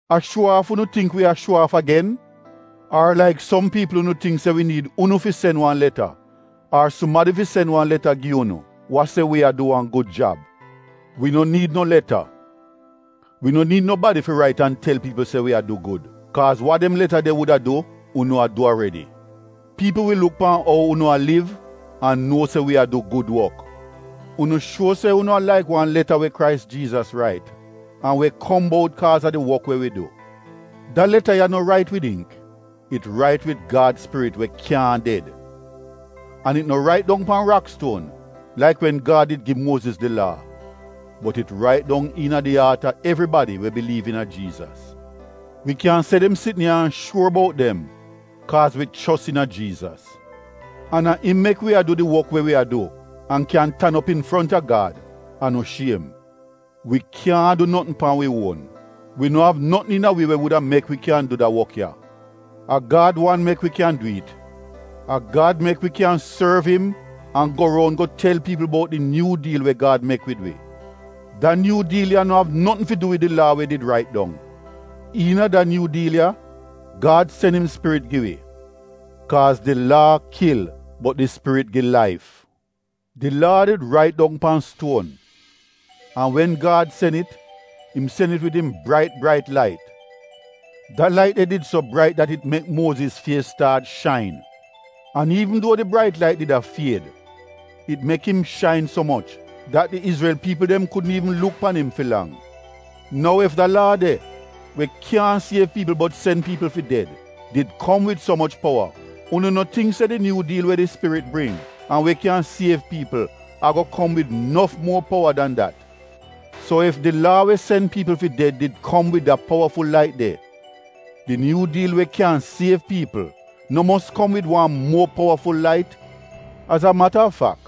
A shuo aaf unu tingk wi a shuo aaf agen? Ar laik som piipl unu tingk se wi niid unu fi sen wan leta ar sumadi fi sen wan leta gi unu wa se wi a du wan gud jab? Wi no niid no leta, wi no niid nobadi fi rait an tel piipl se wi a du gud, kaaz wa dem leta de wuda du unu a du aredi. Piipl wi luk pan ou unu a liv an nuo se wi a du gud wok. Unu shuo se unu a laik wan leta we Krais Jiizas rait, an we kom bout kaaz a di wok we wi du. Da leta ya no rait wid ingk, it rait wid Gad Spirit we kyaahn ded. An it no rait dong pan rakstuon laik wen Gad did gi Muoziz di Laa bot it rait dong iina di aat a evribadi we biliiv iina Jiizas. Wi kyan se dem sitn ya an shuor bout dem kaaz wi chos iina Jiizas. An a im mek wi a du di wok we wi a du an kyan tan op infronta Gad an no shiem. Wi kyaahn du notn pan wi uon. Wi no av notn iina wi we wuda mek wi kyan du da wok ya. A Gad wan mek wi kyan du it. A Gad mek wi kyan sorv im an go roun go tel piipl bout di Nyuu Diil we Gad mek wid wi. Da Nyuu Diil ya no av notn fi du wid di Laa we did rait dong. Iina da Nyuu Diil ya Gad sen im Spirit gi wi; kaaz di Laa kil bot di Spirit gi laif. Di Laa did rait dong pan stuon, an wen Gad sen it, im sen it wid im brait brait lait. Da lait de did so brait dat it mek Muoziz fies staat shain. An iivn duo di brait lait did a fied, it mek im shain so moch dat di Izrel piipl dem kudn iivn luk pan im fi lang. Nou ef da Laa de, we kyaahn siev piipl bot sen piipl fi ded, did kom wid so moch powa unu no tingk se di Nyuu Diil we di Spirit bring an we kyan siev piipl a-go kom wid nof muor powa dan dat? So ef di Laa we sen piipl fi ded did kom wid da powaful lait de, di Nyuu Diil we kyan siev piipl no mos kom wid wan muo powaful lait. Az a mata a fak,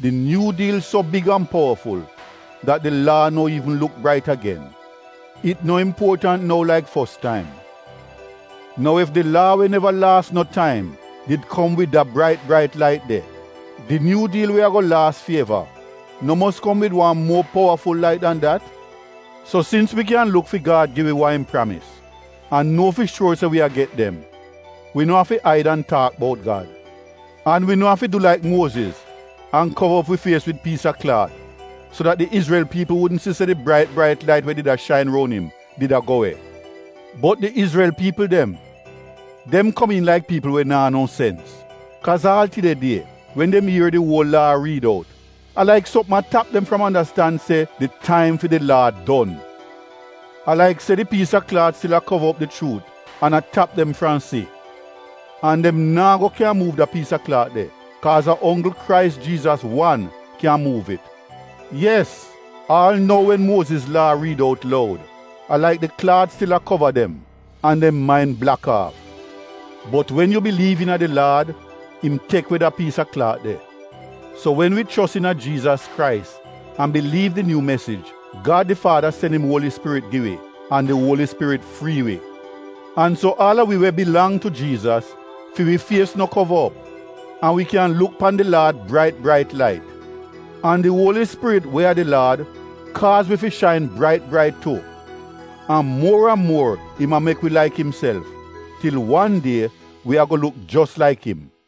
di Nyuu Diil so big an powaful dat di Laa no iivn luk brait agen — it no impuotant nou laik fos taim. Nou ef di Laa we neva laas no taim did kom wid da brait brait lait de, di Nyuu Diil we a-go laas fi eva no mos kom wid wan muor powaful lait dan dat. So sins wi kyan luk fi Gad gi wi wa im pramis an nuo fi shuor se wi a get dem, wi no afi aid an taak bout Gad. An wi no afi du laik Muoziz an kova op wi fies wid piis a klaat so dat di Izrel piipl wudn si se di brait brait lait we did a shain roun im did a go we. Bot di Izrel piipl dem, dem komiin laik piipl we naa no sens. Kaaz aal tide die, wen dem ier di uol Laa a riid out, a laik sopm a tap dem fram andastan se di taim fi di Laa don. A laik se di piis a klaat stil a kova op di chuut an a tap dem fram si. An dem naa go kyan muuv da piis a klaat de kaaz a onggl Krais Jiizas wan kyan muuv it. Yes, aal nou wen Muoziz Laa riid out loud, a laik di klaat stil a kova dem, an dem main blak aaf. Bot wen yu biliiv iina di Laad, im tek we da piis a klaat de. So wen wi chos iina Jiizas Krais an biliiv di Nyuu Mesij, Gad di Faada sen im Uoli Spirit gi wi, an di Uoli Spirit frii wi. An so aal a wi we bilang tu Jiizas, fi wi fies no kova op an wi kyan luk pan di Laad brait brait lait. An di Uoli Spirit we a di Laad kaaz wi fi shain brait brait tu. An muor an muor im a mek wi laik imself, til wan die wi a-go luk jos laik im.